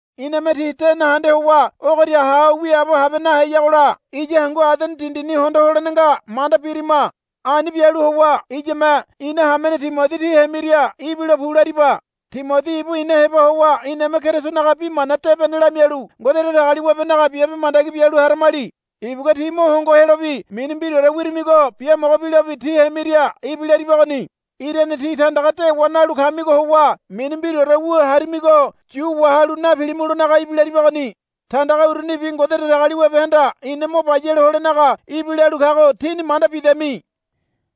Iname tí de nahende howa ogoria ha ho wiaabo habe naheyagola iya hangu Adene dindini hondo holene nga manda birima. Ani bialu howa iyame ina hamene Timodi tí hemiria ibilo pu lariba. Timodi ibu ina heba howa iname Kerisonaga Bi Mana Debene lamialu Ngode Datagaliwabenaga biabe mandagi bialu haramali. Ibugua tí mo hongo helobi mini mbiraore wirimigo biamogo bilobi tí hemiria ibilaribagoni. Irane tí tandaga dewa nalu kamigo howa mini mbiraore wu harimigo yu wahalu napilimulonaga ibilaribagoni. Tandaga urunibi Ngode Datagaliwabehanda ina mo bayale holenaga ibilalu kago tíni manda bidami.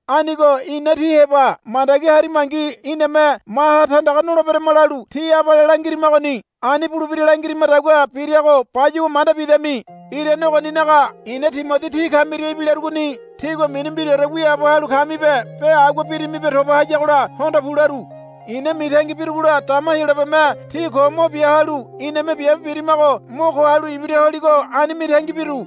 Anigo ina tí heba mandagi harimangi iname maha tandaga noleberama lalu tí abale langirimagoni. Ani bulebira langirimadagua birago bayuwa manda bidami. Irane ogoninaga i̱na Timodi tí kamiria ibilarugoni. Tígua mini mbiraore wiaabo halu kamibe be agua birimibe toba hayagola hondo pu laru. I̱na mitangi birugola dama Heyolabeme tí ko mo bia halu iname biabe birimago mo ko halu ibira holigo ani mitangi biru.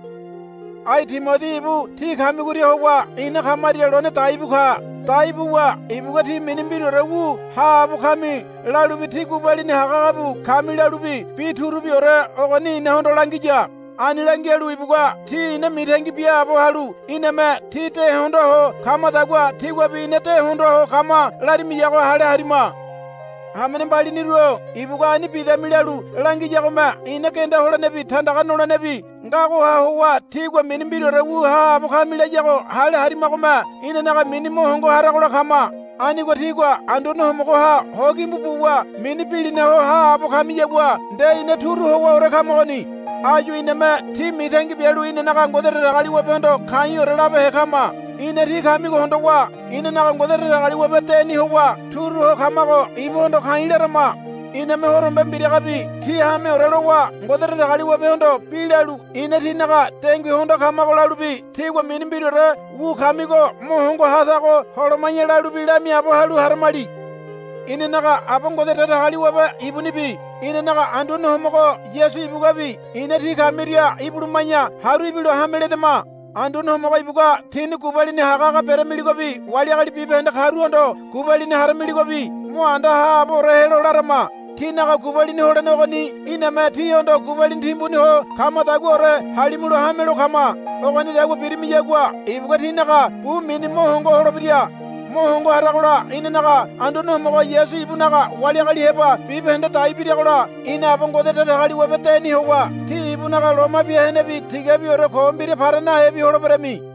Ai Timodi ibu tí kamigoria howa ina kamaria lone daibu ka. Dai buwa ibugua tí mini mbiraore wu haabo kami lalubi tí gubalini hagahaga bu kami lalubi bi turubiore ogoni inahondo langiya. Ani langialu ibugua tí ina mitangi biaabo halu iname tí de hondoa ho kamadagua tíguabi ina de hondoa ho kama larimiyago hale harima. Hamene mbaliniru-o ibugua ani bidami lalu langiyagome ina genda holenebi tandaga nolenebi ngagoha howa tígua mini mbiraore wu haabo kami layago hale harimagome inanaga mini mo hongo haragola kama. Anigo tígua Anduane Homogoha ho gimbu buwa mini bilina ho haabo kamiyagua nde ina turu howaore kamagoni. Áyu iname tí mitangi bialu inanaga Ngode Datagaliwabehondo ka̱i̱ore labehe kama. Ina tí kamigo hondowa inanaga Ngode Datagaliwabe deni howa turu ho kamago ibuhondo ka̱i̱ larama. Iname horombe mbiragabi tí hameore lowa Ngode Datagaliwabehondo bi lalu ina tínaga dengui hondoa kamago lalubi tígua mini mbiraore wu kamigo mo hongo ha tago holoma̱ya lalubi lamiaabo halu haramali. Inanaga Aba Ngode Datagaliwabe ibunibi inanaga Anduane Homogo Yasu ibuguabi ina tí kamiria ibuluma̱ya haru ibilo hame ledama. Anduane Homogo ibugua tíni gubalini hagahaga beramiligobi wali agali bibahende karuhondo gubalini haramiligobi mo anda haaboore helo larama. Tínaga gubalini holene ogoni iname tíhondo gubalini timbuni ho kamadaguaore halimulo hamelo kama. Ogonidagua birimiyagua ibugua tínaga bu mini mo hongo holebira. Mo hongo haragola inanaga Anduane Homogo Yasu ibunaga wali agali heba bibahende dai biragola ina Aba Ngode Datagaliwabe deni howa tí ibunaga loma bia henebi tigabiore ko mbira para nahebi holeberami.